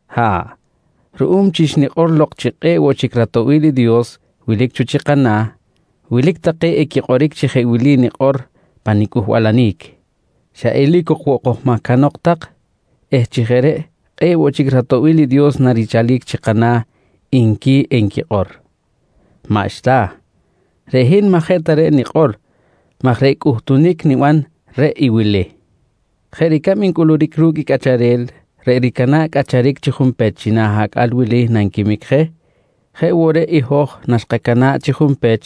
Ha̱ꞌ, ruꞌum chi xnikꞌor lok chi kꞌe̱ꞌ woꞌ chic ratoꞌbil i Dios wilic cho chi kana̱, wilic take equikꞌoric chi jeꞌ wili nikꞌor pa nicꞌuhbalanic: «Xa eli̱c ok woꞌ kojmahcanok tak eh chi jeꞌ reꞌ kꞌe̱ꞌ woꞌ chic ratoꞌbil i Dios narichalic chi kana̱, nqui enquikꞌor. Maꞌxta, reꞌ hin maꞌ jeꞌ ta reꞌ nikꞌor maj reꞌ cꞌuhtunic niban reꞌ i wili: Jeꞌ ricab ncꞌuluric ru̱cꞌ i cꞌacharel reꞌ ricana̱ꞌ cꞌacharic chi junpech china̱ acꞌal wili nanquimic je, jeꞌ woꞌ reꞌ i hoj naxkacana̱ꞌ chi junpech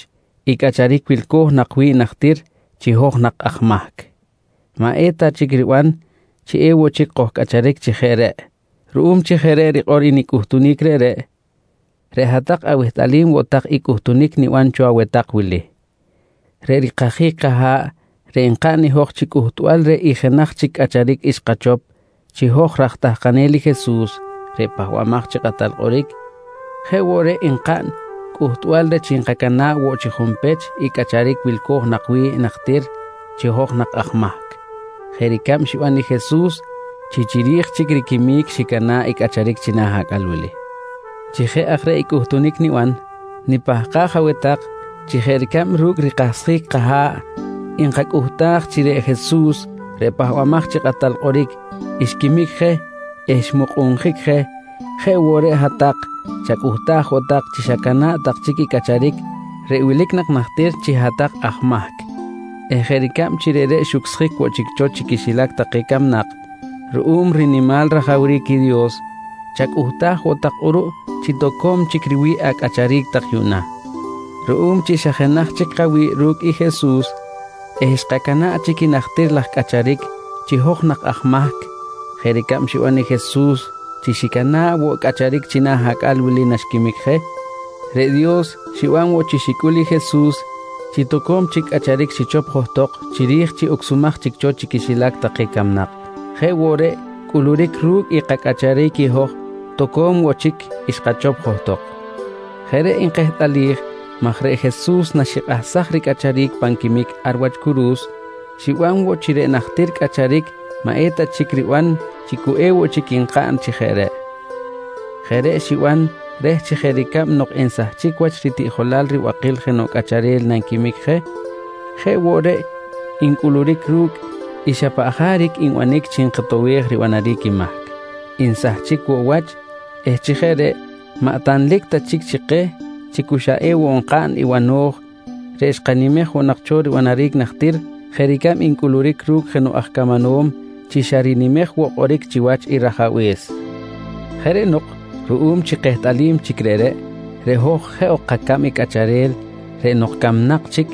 i cꞌacharic wilco̱j nak wi̱ꞌ najtir chi hoj nak aj mahc, maꞌ eta chic riban chi ewoꞌ chic kojcꞌacharic chi jeꞌ reꞌ. Ruꞌum chi jeꞌ reꞌ rikꞌor i nicꞌuhtunic reꞌreꞌ, reꞌ hat-tak awehtꞌalim woꞌ tak i cꞌuhtunic niban cho aweh tak wili: Reꞌ rikajic kaha̱ꞌ reꞌ nkaꞌn i hoj chi cꞌuhtbal reh i jenaj chic cꞌacharic xkachop chi hoj raj tahkanel i Jesus reꞌ Pahbamaj chi Kꞌatal Kꞌoric, jeꞌ woꞌ reꞌ nkaꞌn cꞌuhtbal reh chi nkacana̱ꞌ woꞌ chi junpech i cꞌacharic wilco̱j nak wi̱ꞌ najtir chi hoj nak aj mahc jeꞌ ricab xiban i Jesus chi chiri̱j chic riquimic xicana̱ꞌ i cꞌacharic china̱ acꞌal wili. Chi jeꞌ aj reꞌ i cꞌuhtunic niban, nipahkaj aweh tak chi jeꞌ ricab ru̱cꞌ i rikahsjic kaha̱ꞌ nkacꞌuhtaj chi reꞌ Jesus reꞌ Pahbamaj chi Kꞌatal Kꞌoric, xquimic je eh xmukꞌunjic je jeꞌ woꞌ reꞌ hat-tak chacꞌuhtaj woꞌ tak chi xacana̱ꞌ tak chic i cꞌacharic reꞌ wilic nak najtir chi hat-tak aj mahc eh jeꞌ ricab chi reꞌreꞌ xucsjic woꞌ chic cho chi quixilac take camnak ruꞌum rinimal rajawric i Dios chacꞌuhtaj woꞌ tak kꞌuruꞌ chi toco̱m chic riwi̱ꞌ acꞌacharic tak yuꞌna. Ruꞌum chi xa jenaj chic kawi̱ꞌ ru̱cꞌ i Jesus eh xkacana̱ꞌ chic i najtir laj cꞌacharic chi hoj nak aj mahc jeꞌ ricab xiban i Jesus chi xicana̱ꞌ woꞌ cꞌacharic china̱ acꞌal wili naxquimic je, reꞌ Dios xiban woꞌ chi xicꞌul i Jesus chi toco̱m chic cꞌacharic xichop johtok chiri̱j chi ucsumaj chic cho chi quixilac take camnak, jeꞌ woꞌ reꞌ cꞌuluric ru̱cꞌ i kacꞌacharic i hoj toco̱m woꞌ chic xkachop johtok. Jeꞌ reꞌ nkehtꞌalij maj reꞌ Jesus naxikꞌahsaj ricꞌacharic pan quimic ar wach curu̱s xiban woꞌ chi reꞌ najtir cꞌacharic maꞌeta chic riban chi cu ewoꞌ chic nkaꞌn chi jeꞌ reꞌ. Jeꞌ reꞌ xiban reh chi jeꞌ ricab nok nsahchic wach ritiꞌjolal ribakil jenoꞌ cꞌacharel nanquimic je, jeꞌ woꞌ reꞌ i ncꞌuluric ru̱cꞌ i xa paꞌ jaric nbanic chi nkotowej ribanaric i mahc, nsahchic woꞌ wach eh chi jeꞌ reꞌ maꞌ tanlic ta chic chi keh chi xa cu ewoꞌ nkaꞌn i bano̱j reꞌ xkanimej woꞌ nak cho ribanaric najtir jeꞌ ricab ncꞌuluric ru̱cꞌ jenoꞌ aj camanom chi xa rinimej woꞌ kꞌoric chiwach i rajabe̱s. Jeꞌ reꞌ nok ruꞌum chi kehtꞌalim chic reꞌreꞌ, reꞌ hoj jeꞌ ok kacab i cꞌacharel reꞌ nok camnak chic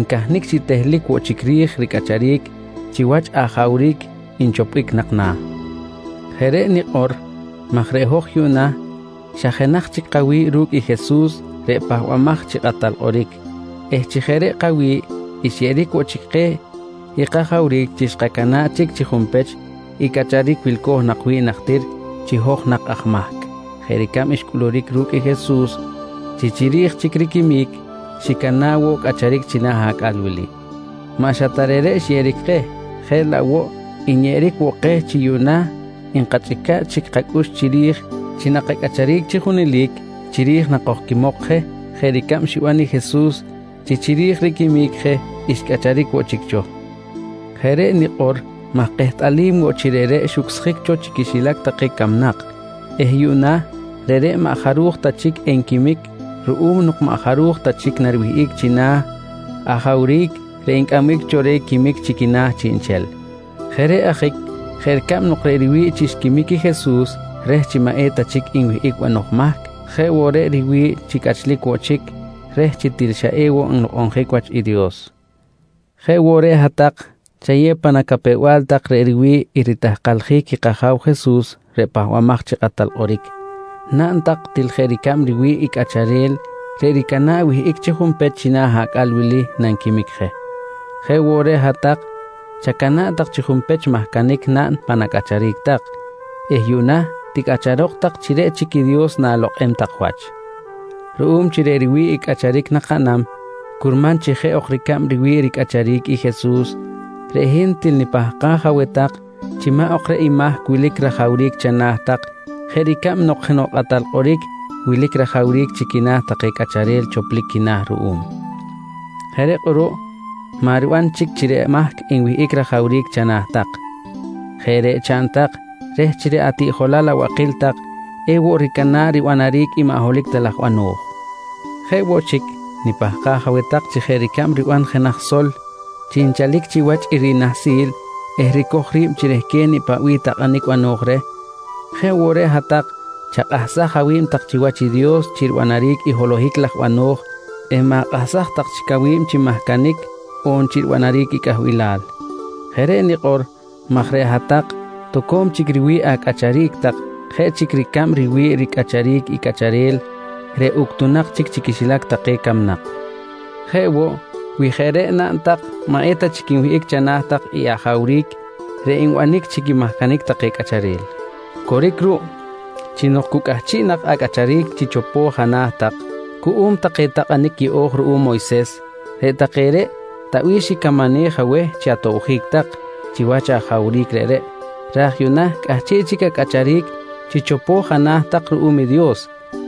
ncahnic chi tehlic woꞌ chic ri̱j ricꞌacharic chiwach ajawric nchopbic nak na̱. Jeꞌ reꞌ nikꞌor maj reꞌ hoj yuꞌna xa jenaj chic kawi̱ꞌ ru̱cꞌ Jesus reꞌ Pahbamaj chi Kꞌatal Kꞌoric eh chi jeꞌ reꞌ kawi̱ꞌ xyeꞌeric woꞌ chic keh i kajawric chi xkacana̱ꞌ chic chi junpech i cꞌacharic wilco̱j nak wi̱ꞌ najtir chi hoj nak aj mahc jeꞌ ricab xcꞌuluric ru̱cꞌ i Jesus chi chiri̱j chic riquimic xicana̱ꞌ woꞌ cꞌacharic china̱ acꞌal wili. Maꞌ xa ta reꞌreꞌ xyeꞌeric keh, jeꞌ laꞌ woꞌ nyeꞌeric woꞌ keh chi yuꞌna nkachꞌica̱ꞌ chic kacꞌux chiri̱j chi nakacꞌacharic chi junelic chiri̱j nakojquimok je jeꞌ ricab xiban i Jesus chi chiri̱j riquimic je xcꞌacharic woꞌ chic cho. Jeꞌ reꞌ nikꞌor maj kehtꞌalim woꞌ chi reꞌreꞌ xucsjic cho chi quixilac take camnak eh yuꞌna reꞌreꞌ maꞌ jaruj ta chic enquimic ruꞌum nok maꞌ jaruj ta chic nariwihꞌic china̱ ajawric reꞌ ncꞌambic cho reh quimic chi quina̱ chiꞌnchel. Jeꞌ reꞌ ajic jeꞌ ricab nok reꞌ riwi̱ꞌ chi xquimic i Jesus reh chi maꞌ eta chic nwihꞌic banoj mahc, je woꞌ reꞌ riwi̱ꞌ chi cꞌachlic woꞌ chic reh chi til xa ewoꞌ nlokꞌonjic wach i Dios, jeꞌ woꞌ reꞌ hat-tak chayew pan acapew-bal tak chi reꞌ riwi̱ꞌ i ritahkaljic i kAja̱w Jesus reꞌ Pahbamaj chi Kꞌatal Kꞌoric naꞌn tak til jeꞌ ricab riwi̱ꞌ i cꞌacharel reꞌ ricana̱ꞌ wihꞌic chi junpech china̱ acꞌal wili nanquimic je, jeꞌ woꞌ reꞌ hat-tak chacana̱ꞌ tak chi junpech mahcanic naꞌn pan acꞌacharic tak eh yuꞌna ticꞌacharok tak chi reꞌ chic i Dios na̱lokꞌem tak wach. Ruꞌum chi reꞌ riwi̱ꞌ i cꞌacharic nakaꞌnam curman chi jeꞌ ok ricab riwi̱ꞌ ricꞌacharic i Jesus, reꞌ hin til nipahkaj aweh tak chi maꞌ ok chic reꞌ i mahc wilic rajawric chana̱ tak, jeꞌ ricab nok jenoꞌ kꞌatal kꞌoric wilic rajawric chi quina̱ take cꞌacharel choplic quina̱ ruꞌum. Jeꞌ reꞌ kꞌuruꞌ maꞌ riban chic chi reꞌ mahc enwihꞌic rajawric chana̱ tak. Jeꞌ reꞌ chaꞌn tak reh chi reꞌ atiꞌjolal abakil tak ewoꞌ ricana̱ꞌ ribanaric i maꞌ holohic ta laj bano̱j. Jeꞌ woꞌ chic nipahkaj aweh tak chi jeꞌ ricab riban jenaj sol chi nchalic chiwach i rinahsi̱l eh ricoj ri̱b chi rehquen i paꞌ bih takꞌanic bano̱j reh, jeꞌ woꞌ reꞌ hat-tak chakꞌahsaj awi̱b tak chiwach i Dios chi ribanaric i holohic laj bano̱j eh ma̱kꞌahsaj tak chic awi̱b chi mahcanic on chi ribanaric i cꞌahbilal. Jeꞌ reꞌ nikꞌor maj reꞌ hat-tak toco̱m chic riwi̱ꞌ acꞌacharic tak jeꞌ chic ricab riwi̱ꞌ ricꞌacharic i cꞌacharel reꞌ uctunak chic chi quixilac take camnak. Jeꞌ woꞌ, wi jeꞌ reꞌ naꞌn tak maꞌ eta chic nwihꞌic chana̱ tak i ajawric reꞌ nbanic chi quimahcanic take cꞌacharel. Coric ruꞌ chi nok cu cꞌahchiꞌ nak acꞌacharic chi chopo̱j ana̱ tak cuꞌum take takꞌanic yeꞌo̱j ruꞌum Moyses reꞌ take reꞌ ta bih xicamanej aweh chi atobjic tak chiwach ajawric reꞌreꞌ raj yuꞌna cꞌahchiꞌ chic acꞌacharic chi chopo̱j ana̱ tak ruꞌum i Dios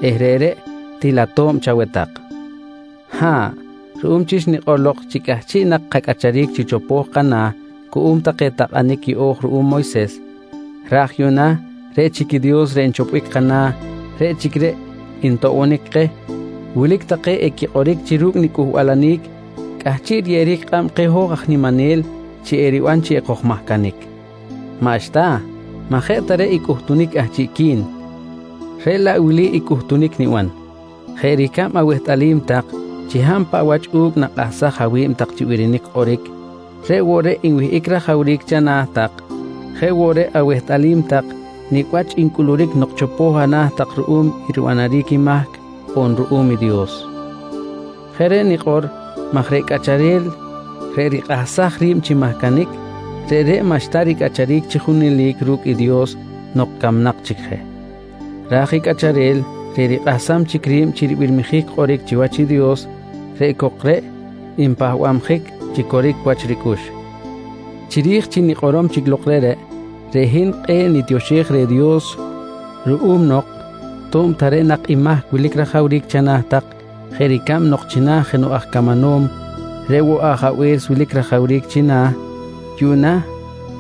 eh reꞌreꞌ til ato̱b chaweh tak. Ha̱ꞌ, ruꞌum chi xnikꞌor lok chi cꞌahchiꞌ nak kacꞌacharic chi chopo̱j kana̱ cuꞌum take takꞌanic yeꞌo̱j ruꞌum Moyses raj yuꞌna reꞌ chic Dios reꞌ nchopbic kana̱ reꞌ chic reꞌ ntoꞌbonic keh, wilic take equikꞌoric chi ru̱cꞌ nicꞌuhbalanic cꞌahchiꞌ riyeꞌeric kꞌab keh hoj aj niminel chi eriban chi ekojmahcanic. Maꞌxta, maꞌ jeꞌ ta reꞌ i cꞌuhtunic cꞌahchiꞌqui̱n reꞌ laꞌ wili cꞌuhtunic niban: Jeꞌ ricab awehtꞌalim tak chi hab paꞌ wach u̱cꞌ nakꞌahsaj awi̱b tak chi birinic kꞌoric reꞌ woꞌ reꞌ nwihꞌic rajawric chana̱ tak, jeꞌ woꞌ awehtꞌalim tak nicꞌ wach ncꞌuluric nok chopo̱j ana̱ tak ruꞌum i ribanaric i mahc on ruꞌum i Dios. Jeꞌ reꞌ nikꞌor maj reꞌ cꞌacharel reꞌ rikꞌahsaj ri̱b chi mahcanic, reꞌreꞌ maꞌxta ricꞌacharic chi junelic ru̱cꞌ i Dios nok camnak chic je. Raj i cꞌacharel reꞌ rikꞌahsam chic ri̱b chi ribirmijic kꞌoric chiwach i Dios reꞌ cok reꞌ npahbabjic chi coric wach ricꞌux. Chiri̱j chi nikꞌorom chic lok reꞌreꞌ, reꞌ hin kꞌe̱ꞌ nitioxej reh Dios ruꞌum nok to̱b ta reꞌ nak i mahc wilic rajawric chana̱ tak jeꞌ ricab nok china̱ jenoꞌ aj camanom reꞌ woꞌ ajabe̱s wilic rajawric china̱, yuꞌna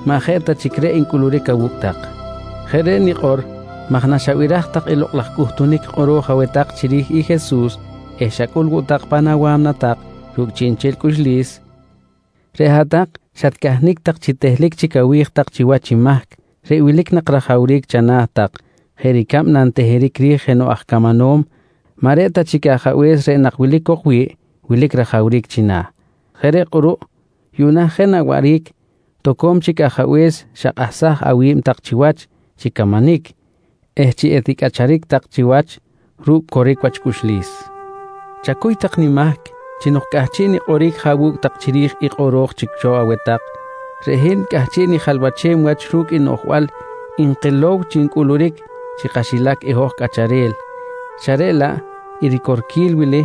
maꞌ jeꞌ ta chic reꞌ ncꞌuluric awu̱cꞌ tak. Jeꞌ reꞌ nikꞌor maj naxabiraj tak i lokꞌ laj cꞌuhtunic kꞌoro̱j aweh tak chiri̱j i Jesus eh xacꞌul woꞌ tak pan awa̱mna tak ru̱cꞌ chiꞌnchel cꞌuxlis, reꞌ hat-tak xatcahnic tak chi tehlic chic awi̱j tak chiwach i mahc reꞌ wilic nak rajawric chana̱ tak jeꞌ ricab nanteheric ri̱j jenoꞌ aj camanom maꞌ reꞌ ta chic i ajabe̱s reꞌ nak wilic cok wi̱ꞌ wilic rajawric china̱. Jeꞌ reꞌ kꞌuruꞌ yuꞌna jeꞌ na waꞌric toco̱m chic ajabe̱s xakꞌahsaj awi̱b tak chiwach chi camanic eh chi eticꞌacharic tak chiwach ru̱cꞌ coric wach cꞌuxlis. Chacuy tak nimahc chi nok cꞌahchiꞌ nikꞌoric je awu̱cꞌ tak chiri̱j i kꞌoro̱j chic cho aweh tak, reꞌ hin cꞌahchiꞌ nijalwachem wach ru̱cꞌ i noꞌjbal nkilow chi ncꞌuluric chi kaxilac i hoj cꞌacharel xa reꞌ laꞌ i ricorquil wili,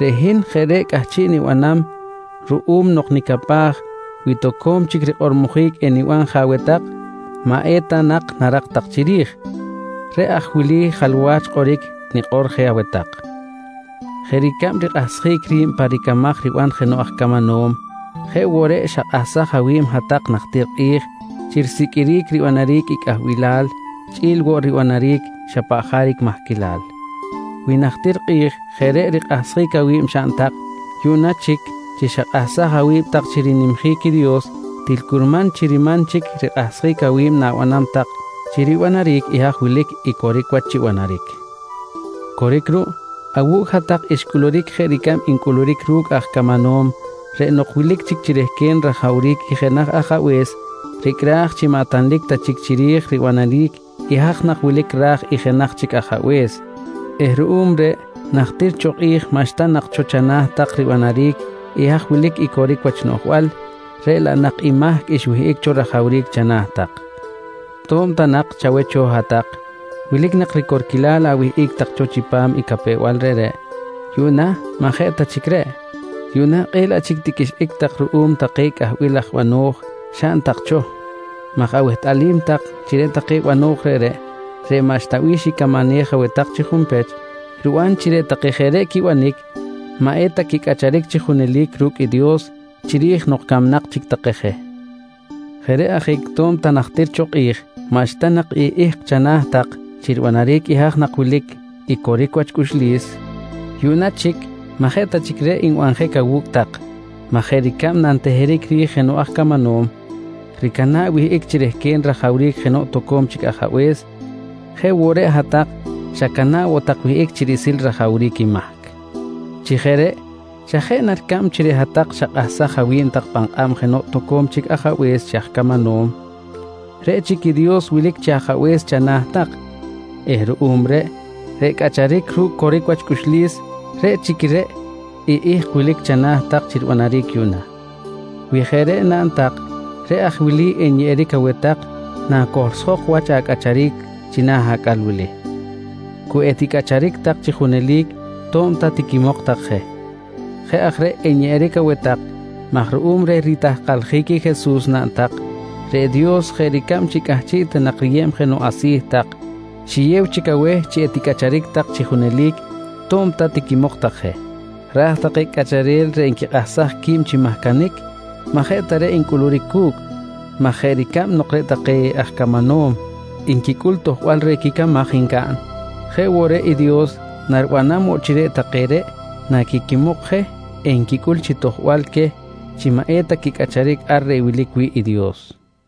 reꞌ hin jeꞌ reꞌ cꞌahchiꞌ nibanam ruꞌum nok nicapaj wi toco̱m chic rikꞌormojic eniban je aweh tak maꞌ eta nak narak tak chiri̱j. Reꞌ aj wili jalwach kꞌoric nikꞌor je aweh tak: Jeꞌ ricab rikꞌahsjic ri̱b pa ricamaj riban jenoꞌ aj camanom jeꞌ woꞌ reꞌ xakꞌahsaj awi̱b hat-tak najtir kꞌi̱j chi risiqꞌuiric ribanaric i cꞌahbilal chꞌi̱l woꞌ ribanaric xa paꞌ jaric mahquilal. Wi najtir kꞌi̱j jeꞌ reꞌ rikꞌahsjic awi̱b xaꞌn tak, yuꞌna chic chi xakꞌahsaj awi̱b tak chi rinimjic i Dios til curman chi riman chic rikꞌahsjic awi̱b na̱banam tak chi ribanaric i haj wilic i coric wach chi banaric. Coric ruꞌ, awu̱cꞌ hat-tak xcꞌuluric jeꞌ ricab ncꞌuluric ru̱cꞌ aj camanom reꞌ nok wilic chic chi rehquen rajawric i jenaj ajabe̱s, ricꞌraj chi maꞌ tanlic ta chic chiri̱j ribanaric i haj nak wilic ra̱j i jenaj chic ajabe̱s eh ruꞌum reꞌ najtir cho kꞌi̱j maꞌxta nak cho chana̱ tak ribanaric i haj wilic i coric wach noꞌjbal reꞌ laꞌ nak i mahc xwihꞌic cho rajawric chana̱ tak. To̱b ta nak chaweh cho hat-tak wilic nak ricorquilal awihꞌic tak cho chipam i capew-bal reꞌreꞌ, yuꞌna maꞌ jeꞌ ta chic reꞌ. Yuꞌna kꞌe̱ꞌ laꞌ chic tiqꞌuixꞌic tak ruꞌum take cꞌahbil laj bano̱j xaꞌn tak cho maj awehtꞌalim tak chi reꞌ take bano̱j reꞌreꞌ, reꞌ maꞌxta bih xicamanej aweh tak chi junpech, riban reꞌ chi reꞌ take jeꞌ reꞌ quibanic maꞌ eta quicꞌacharic chi junelic ru̱cꞌ i Dios chiri̱j nok camnak chic take je. Jeꞌ reꞌ ajic to̱b ta najtir cho kꞌi̱j maꞌxta nak i ihk chana̱ tak chi ribanaric i haj nak wilic i coric wach cꞌuxlis, yuꞌna chic maꞌ jeꞌ ta chic reꞌ nbanjic awu̱cꞌ tak maj jeꞌ ricab nanteheric ri̱j jenoꞌ aj camanom, ricana̱ꞌ wihꞌic chi rehquen rajawric jenoꞌ toco̱m chic ajabe̱s, jeꞌ woꞌ reꞌ hat-tak xacana̱ꞌ woꞌ tak wihꞌic chi riꞌsil rajawric i mahc. Chi jeꞌ reꞌ xa jeꞌ na ricab chi reꞌ hat-tak xakꞌahsaj awi̱b tak pan kꞌab jenoꞌ toco̱m chic ajabe̱s chi aj camanom, reꞌ chic i Dios wilic chi Ajabe̱s chana̱ tak eh ruꞌum reꞌ, reꞌ cꞌacharic ru̱cꞌ coric wach cꞌuxlis reꞌ chic reꞌ i ihk wilic chana̱ tak chi ribanaric yuꞌna. Wi jeꞌ reꞌ naꞌn tak reꞌ aj i wili enyeꞌeric aweh tak nacohlsjok wach acꞌacharic china̱ acꞌal wili: Cu eticꞌacharic tak chi junelic to̱b ta tiquimok tak je. Jeꞌ aj reꞌ enyeꞌeric aweh tak maj ruꞌum reh ritahkaljic i Jesus naꞌn tak, reꞌ Dios jeꞌ ricab chi cꞌahchiꞌ ta nak riyeb jenoꞌ asi̱ tak, xiyew chic aweh chi eticꞌacharic tak chi junelic to̱b ta tiquimok tak je. Raj take cꞌacharel reꞌ nquikꞌahsaj qui̱b chi mahcanic maꞌ jeꞌ ta reꞌ ncꞌuluric cu̱cꞌ maj jeꞌ ricab nok reꞌ take aj camanom nquicꞌul tojbal reh quicamaj ncaꞌn, jeꞌ woꞌ reꞌ i Dios naribanam woꞌ chi reꞌ take reꞌ naquiquimok je enquicꞌul chi tojbal queh chi maꞌ eta quicꞌacharic ar reꞌ wilic wi̱ꞌ i Dios.